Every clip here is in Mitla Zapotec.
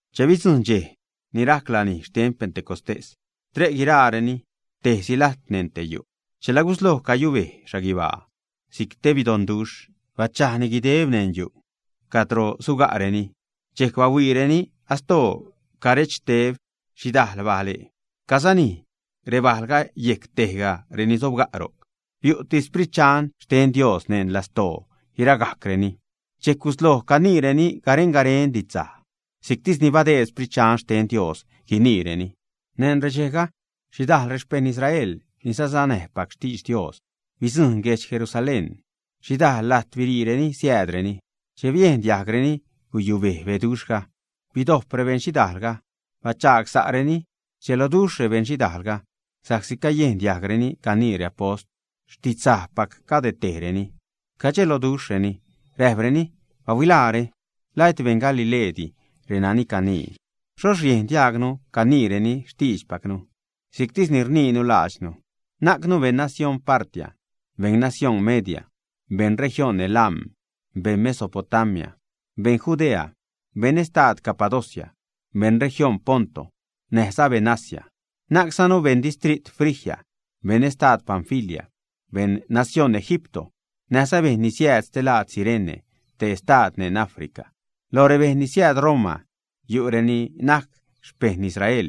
Che bidzujṉ dxej ni rajc lanij xten Pentecostés, tre' guiraareni tejsi lajt neṉ te yu', chela gusloj cayubej xhaguibaa si'c te beroduxh, bachajni guideb neṉ yu' cadro suga'reni. Dxejc bahuiireni astoo carechxteb xhidajl bale' casanij rebajlga yejc tejga reni sojb ro'c. Biu'ti Sprit Dxan xten Dios neṉ lastoo guiragajcreni. Dxejc gusloj caniireni garen-garen didxsaj si'ctisni badeed Sprit Dxan xten Dios guiniireni. Neṉ redxejga, xhidajl rexpejṉ Israel ni sasanäjpac xtidx Dios bidzujṉ guedx Jerusalén. Xhidajl lajt biriireni siäädreni. Che biejn diajgreni guyubej beduxhga, bidojp rebeṉ xhidaalga, bachaag sa'reni. Rdxeloduxh rebeṉ xhidalga sa'csi cayejn diajgreni canii reapost xtidxsajpac cade tejreni. Cadxelojreni räjpreni: ―¡Bahuilaare! ¿La et beṉ Galileedi renani canii, ä? ¿Xhoxh riejn diajgnu caniireni xtiidxpacnu si'ctis ni rniinu laadxnu, ä? Najcnu beṉ nacióṉ Partia, beṉ nacióṉ Media, beṉ región Elam, beṉ Mesopotamia, beṉ Judea, beṉ estad Capadocia, beṉ región Ponto, näjza beṉ Asia. Najczanu beṉ distrit Frigia, beṉ estad Panfilia, beṉ nacióṉ Egipto, näjza bejṉ ni siääd stelaad Cirene, te estad neṉ Africa. Loj rebejṉ ni siääd Roma yu' reni najc xpejṉ Israel,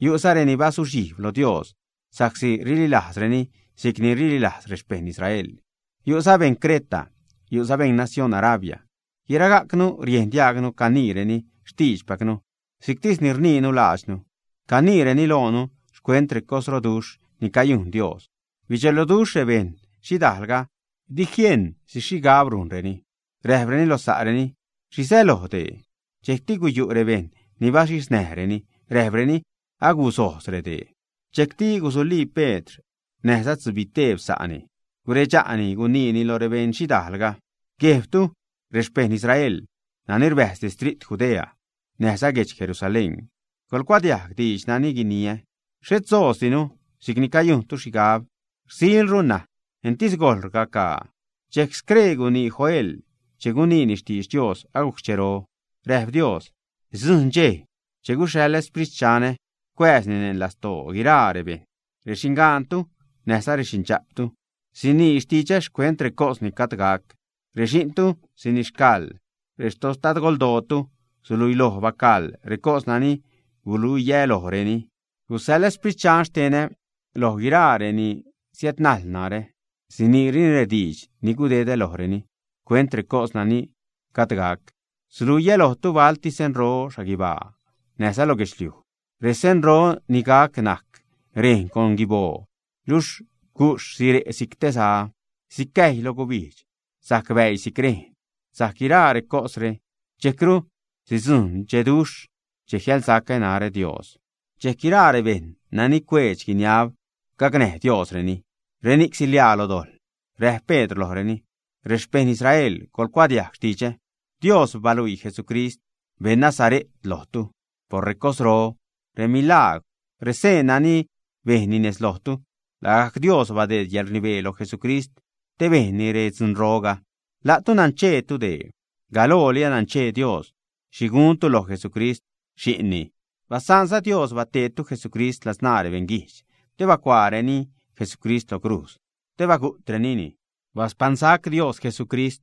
yu'za reni bazuxhijb lo Dios sa'csi rililajzreni si'cni rililajz rexpejṉ Israel. Yu'za beṉ Creta. Yu'za beṉ nacióṉ Arabia. Guiragajcnu riejn diajgnu caniireni xtiidxpacnu si'ctis ni rniinu laadxnu. Caniireni loonu xcuent recosroduxh ni cayujn Dios. Bidxeloduxh rebeṉ xhidaalga, dijiejṉ xhi xhigab gunreni. Räjpreni lo sa'reni: ―¿Xhi säloj dee? Dxejcti guyu' rebejṉ ni baxhiznäjreni, räjpreni: ―Agusojz redee. Dxejcti gusulii Pedr näjza tzubiteeb sa'ni, guredxa'ni guniini lo rebeṉ xhidaalga: ―Guejbtu, rexpejṉ Israel, nani rbäjz distrit Judea näjza guedx Jerusalén. Coḻcuadiajg diidx nani guiniä. Xhet sojzdinu si'cni cayujntu xhigab. Rsilru ṉaj, entis gojl rcagaa. Dxejc scree gunii Joel che guniini xtidx Dios agujc xchero. Räjp Dios: Sidzujṉ dxej che guxhaḻä Xsprit Dxanä cuääzni neṉ lastoo guiraa rebejṉ. Rexingaantu näjza rexindxa'ptu sinii xtidxä xcuent recos ni gajd gac. Rexi'ntu sinixcaḻ, rextadgoldootu suluiloj bacaḻ recos nani guluiä lojreni. Guxhaḻä Xsprit Dxanä loj guiraa reni siädnajl narä. Siniireni rediidx ni gudedä lojreni xcuent recos nani gajd gac. Suluiä lojtu balti senro xhaguibaa näjza lo guedxliuj. Resenro ni gac najc rejn con guiboo, luxh guxh sire' si'c te za. Sicäjy loj gubijdx, sajc bäii si'c rejn. Sajc guiraa recosre, dxejcru sidzujṉ dxeduxh che jiälsacä narä, Dios. Dxejc guiraa rebejṉ nani cueedx guiniab gacnäj Diosreni, reni'c siḻiaa lo dojḻ. Räjp Pedr lojreni: ―Rexpejṉ Israel, coḻcuadiajg xtidxä. Dios baluii Jesucrist, beṉ Nazare't, lojtu por recosro, remilagwr, reseen nani bejnni nez lojtu. Lagajc Dios badeed yäḻrnibee loj Jesucrist te bejnni redzunroga. La'tu nancheetu dee. Galooli ananchee Dios xhi guntu loj Jesucrist Xi'nni. Basaanza Dios bateedtu Jesucrist ladzṉaa rebeṉguijdx te bacuaareni Jesucrist lo crujz te bagu'trenini. Baspaṉsac Dios Jesucrist,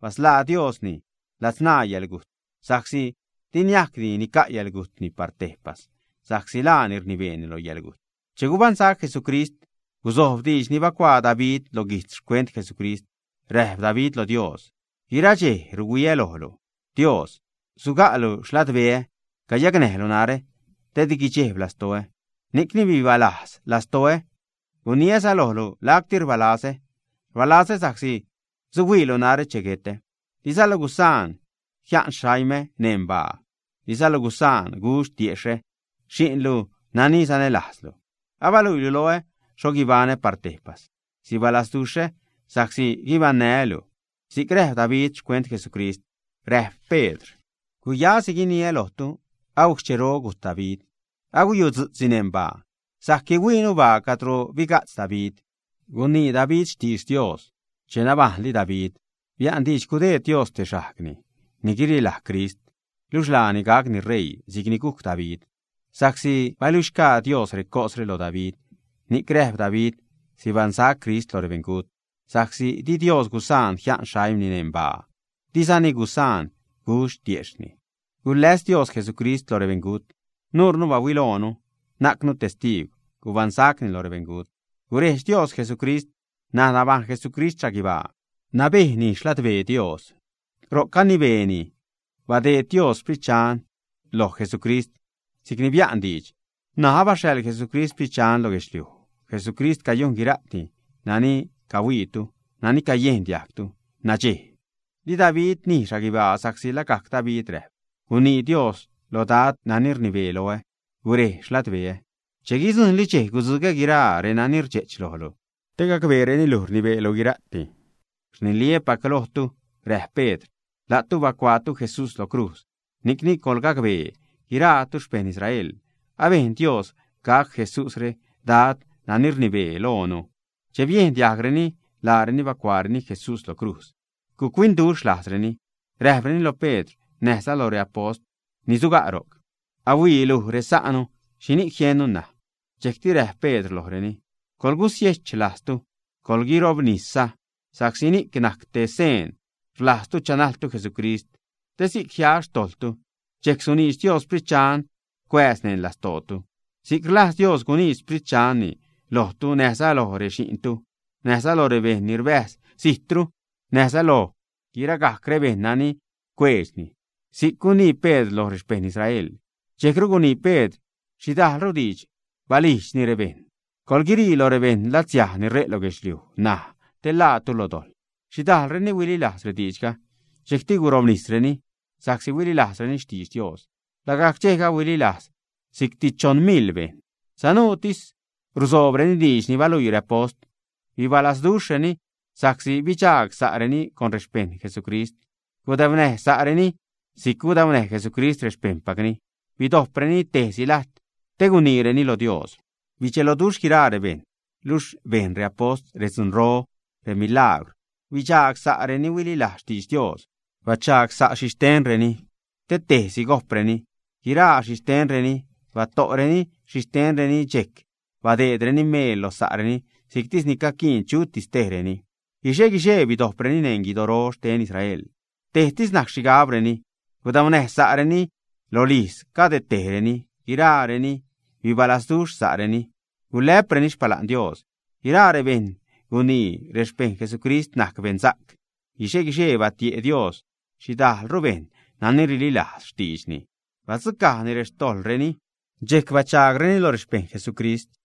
basḻaa Diosni ladzṉaa yäḻgujt, sa'csi di niajcdi nica' yäḻgujtni par tejpas, sa'csi laani rnibee lo yäḻgujt. Che gubaṉsac Jesucrist, guzojb diidx ni bacuaa David lo guijtz xcuent Jesucrist. Räjp David lo Dios: Guira dxej ruhuiä lojlu, Dios. Suga'lu xladbeä cayacnäjlu narä te di guidxejb lastoä. Ni'cni bibalajz lastoä, guniäza lojlu lacti rbaa lazä. Rbalazä sa'csi suhuiilu narä che guetä. Dizalu gusaan jia'n xaimä neṉ baa. Dizalu gusaan gudx tiejxh xi'nlu nani sanälajzlu. Abaluiilu loä xho guibaṉä par tejpas. Sibalazduxhä sa'csi guibaṉnää́ luj, si'c räjp David xcuent Jesucrist. Räjp Pedr: ―Guyasi guiniä lojtu agujc xchero gujt David. Aguyutzu'tzni neṉ baa. Sajc guihuiinu baa cadro biga'tz David. Gunii David xtidx Dios. Che nabajṉli David bia'n diidx gudeed Dios te xajgni ni guirilaj Crist, luxh laani gacni ṟeii si'cni gujc David. Sa'csi baluixgaa Dios recosre lo David, ni'c räjp David sibaṉsac Crist lo rebeṉgut sa'csi di Dios gusaan jia'n xaimni neṉ baa, dizani gusaan gudx tiejxhni. Guläs Dios Jesucrist lo rebeṉgut. Nuure bahuiloonuni, najcnu testiigw gubaṉsacni lo rebeṉgut. Gurejdx Dios Jesucrist. N̲aj nabajṉ Jesucrist xhaguibaa, nabejni xladbee Dios ro'c canibeeni. Badeed Dios Xsprit Dxanni loj Jesucrist si'cni bia'n diidx. N̲aj abaxhaḻ Jesucrist Sprit Dxan lo guedxliuj. Jesucrist cayujn guira'ti nani cahuiitu, nani cayejn diajgtu nadxej. Di David nij xhaguibaa, sa'csi lagajc David räjp: Gunii Dios lo Dad nani rnibee loä: “Gurej xladbeä che guidzujṉli dxej gudzugä guiraa reni rdxe'ch lojlu te gacbeereni luj rnibeelu guira'ti.” ’Rniliä́pac lojtu ―räjp Pedr―. La'tu bacuaatu Jesús lo crujz. Ni'cni, coḻgacbee, guiraatu xpeṉ Israel, abejn Dios gac Jesúsre Dad nani rnibee loonu. Che biejn diajgreni laareni bacuaareni Jesús lo crujz, guc-huinduxh lajzreni. Räjpreni lo Pedr näjza lo reapost ni suga' ro'c: ―Aiilu, resa'nu, ¿xhini'c jiennu ṉaj? Dxejcti räjp Pedr lojreni: ―Coḻgusiech lajztu, coḻguirobnisza, sa'csi ni'c najc te seen rlajztu chanajltu Jesucrist, te si'c jia xtojḻtu. Dxejc suniidx Dios Sprit Dxan cuääz neṉ lastootu. Si'c rlajz Dios guniidx Xsprit Dxanni lojtu näjza loj rexi'ntu, näjza lo rebejṉ ni rbäjz zijtru, näjza loj guiragajc rebejṉ nani cueedxni ―si'c gunii Pedr lo rexpejṉ Israel. Dxejcru gunii Pedr xhidajlru diidx, balijdxni rebejṉ: ―Coḻguirii loj rebeṉ latsiaj ni re' lo guedxliuj ṉaj, te ḻaatu lo dojḻ. Xhidajlreni huililajz rediidxga. Dxejcti gurobnisreni sa'csi huililajzreni xtidx Dios. Lagajc dxejga huililajz si'cti choṉ miḻ bejṉ. Sanuutis rusoobreni diidx ni baluii reapost, bibalazduxhreni sa'csi bidxaag sa'reni con rexpejṉ Jesucrist, gudaunäj sa'reni si'c gudaunäj Jesucrist rexpejṉpacni, bidojpreni tejsi lajt te guniireni lo Dios. Bidxeloduxh guiraa rebejṉ luxh bejn reapost redzunro, remilagwr. Bichaag sa' renani huililajz xtidx Dios. Bachagsa'reni xhixtenreni te tejsi gojpreni guiraa xhixtenreni. Bato'reni xhixtenreni, dxejcti badeedreni meel lo sa'reni si'ctis ni caquiin chutis tejreni. Guixe-guixee bidojpreni neṉ guidoro xten Israel. Tejsi najc rexhigabreni. Gudaunäj sa'reni rolijz cadetejreni, guiraareni bibalaznäduxh sa'reni. Gulä'preni xpala'n Dios. Guiraa rebejṉ gunii rexpejṉ Jesucrist najc beṉsa'c. Guixe-guixee batie' Dios xhidajlru bejṉ nani rililajz xtiidxni, badzucajni rextojḻreni, dxejc bachaagreni lo rexpejṉ Jesucrist.